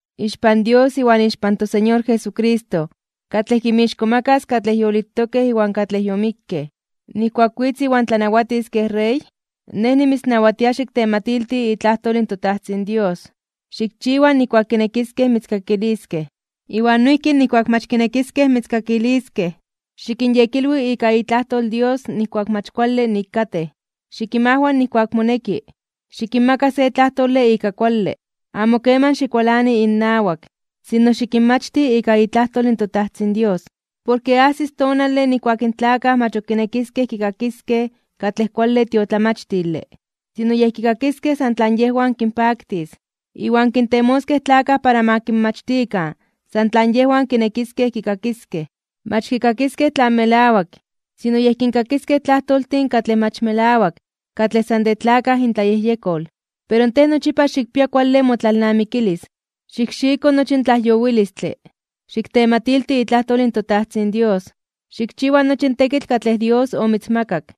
Ixpan Dios iwan ixpan toSeñor Jesucristo, katlej kinmixkomakas (kintzonmanas) katlej yolitokej iwan katlej yomikkej, nijkuak witz iwan tlanawatis kej Rey, nej nimitznawatia xiktematilti itlajtol toTajtzin Dios. Xikchiwa nijkuak kinekiskej mitzkakiliskej, iwan noijki nijkuak mach kinekiskej mitzkakiliskej. Xikinyekilwi ika itlajtol in Dios nijkuak mach kuale nik katej, xikinmajwa nijkuak moneki, xikinmaka se tlajtole ika kuale. Amo keman xikualani innawak, sino xikinmachti ika itlajtol in toTajtzin Dios. Porke ajsis tonale nijkuak in tlakaj mach ok kinekiskej kikakiskej katlej kuale tiotlamachtile. Sino, yej kikakiskej san tlan yejwan kinpaktis. Iwan kintemoskej tlakaj para ma kinmachtikan san tlan yejwan kinekiskej kikakiskej. Mach kikakiskej tlan melawak, sino yej kinkakiskej tlajtoltin katlej mach melawak katlej san de tlakaj intlayejyekol. Pero tej nochipa xikpia kuale motlalnamikilis, xikxiko nochi in tlajyowilistle, xiktematilti itlajtol in toTajtzin Dios, xikchiwa nochi in tekitl katlej Dios omitzmakak.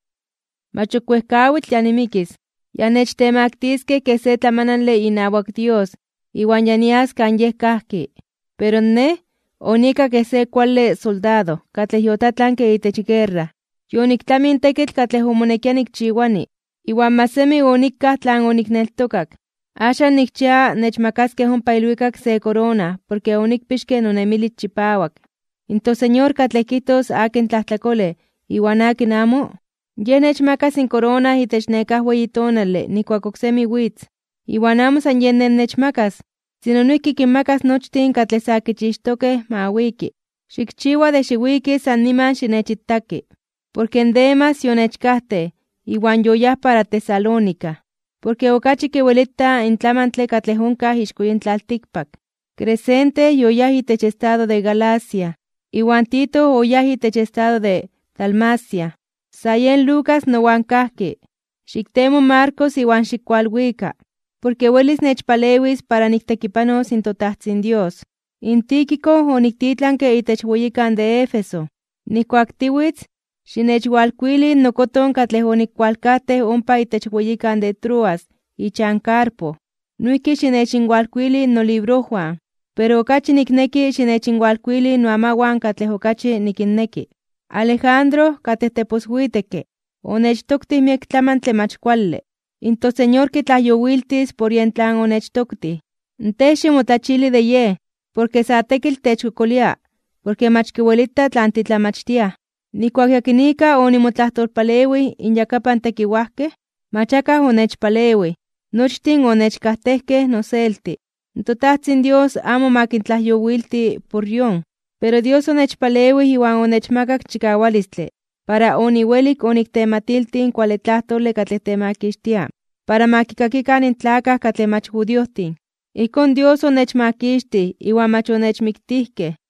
Mach ok wejkawitl ya nimikis. Ya nechtemaktiskej (nechtemaktiliskej) kej se tlamanale inawak Dios iwan ya nias kan Yej kajki. Pero nej, onieka kej se kuale soldado katlej yotlatlanke itech guerra, yoniktlamij in tekitl katlej omonekia nikchiwani, iwan mach semi onikaj tlan onikneltokak. Axan nikchia nechmakaskej ompa ilwikak se korona porke onikpixke nonemilis chipawak. In toSeñor, katlej kijtos akin tlajtlakolej iwan akin amo, Yej nechmakas in korona itech nekáj weyi tonale nijkuak oksemi witz. Iwan amo san yen nej nechmakas, sino noijki kinmakas nochtin katlej sa kichixtokej ma wiki. Xikchiwa de xiwiki san niman xinechitaki. Porke Demas yonechkajtej iwan yoyáj para Tesalónica, porke okachi kiwelita in tlamantle katlej onkaj ixko yin tlaltikpak. Crescente yoyáj itech estado de Galacia, iwan Tito oyáj itech estado de Dalmacia. Sa yen Lucas nowan kajki. Xiktemo in Marcos iwan xikkualwika, porke welis nechpalewis para niktekipanos in toTajtzin Dios. In Tíquico oniktitlanke itech weyikan de Éfeso. Nijkuak tiwitz, xinechwalkuili nokoton katlej onikualkajtej ompa itech weyikan de Troas ichan Carpo. Noijki xinechinwalkuili nolibrojwan, pero okachi nikneki xinechinwalkuili noamawan katlej okachi nikinneki. Alejandro, katlej teposwitekke (teposyektlalij) onechtoktij miek tlamantle mach kuale. In Señor kitlajyowiltis por yen tlan onechtoktij. Tej ximotlachili de yej, porke sa tekitl techkokolia porke mach kiwelita tlan titlamachtiaj. Nijkuak yakinika onimotlajtolpalewij inyakapan tekiwajkej, mach akaj onechpalewij. Nochtin onechkajtejkej noselti. In toTajtzin Dios amo ma kintlajyowilti por yon. Pero Dios onechpalewij iwan onechmakak chikawalistle para oniwelik oniktematiltij in kuale tlajtole katlej temakixtia para ma kikakikan in tlakaj katlej mach judiojtin. Ijkón Dios onechmakixtij iwan mach onechmiktijkej.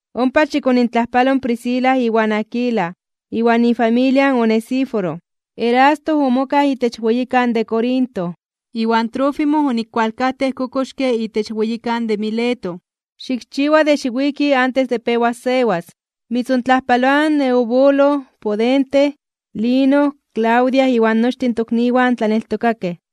Ompa xikonintlajpalo in Prisca iwan Aquila, iwan ifamilia in Onesíforo. Erasto omokaj itech weyikan de Corinto, iwan Trófimo onikualkajtej kokoxke itech weyikan de Mileto. Xikchiwa de xiwiki antes de pewas sewas. Mitzontlajpaloaj in Eubulo, Pudente, Lino, Claudia iwan nochtin in tokniwan tlaneltokakej.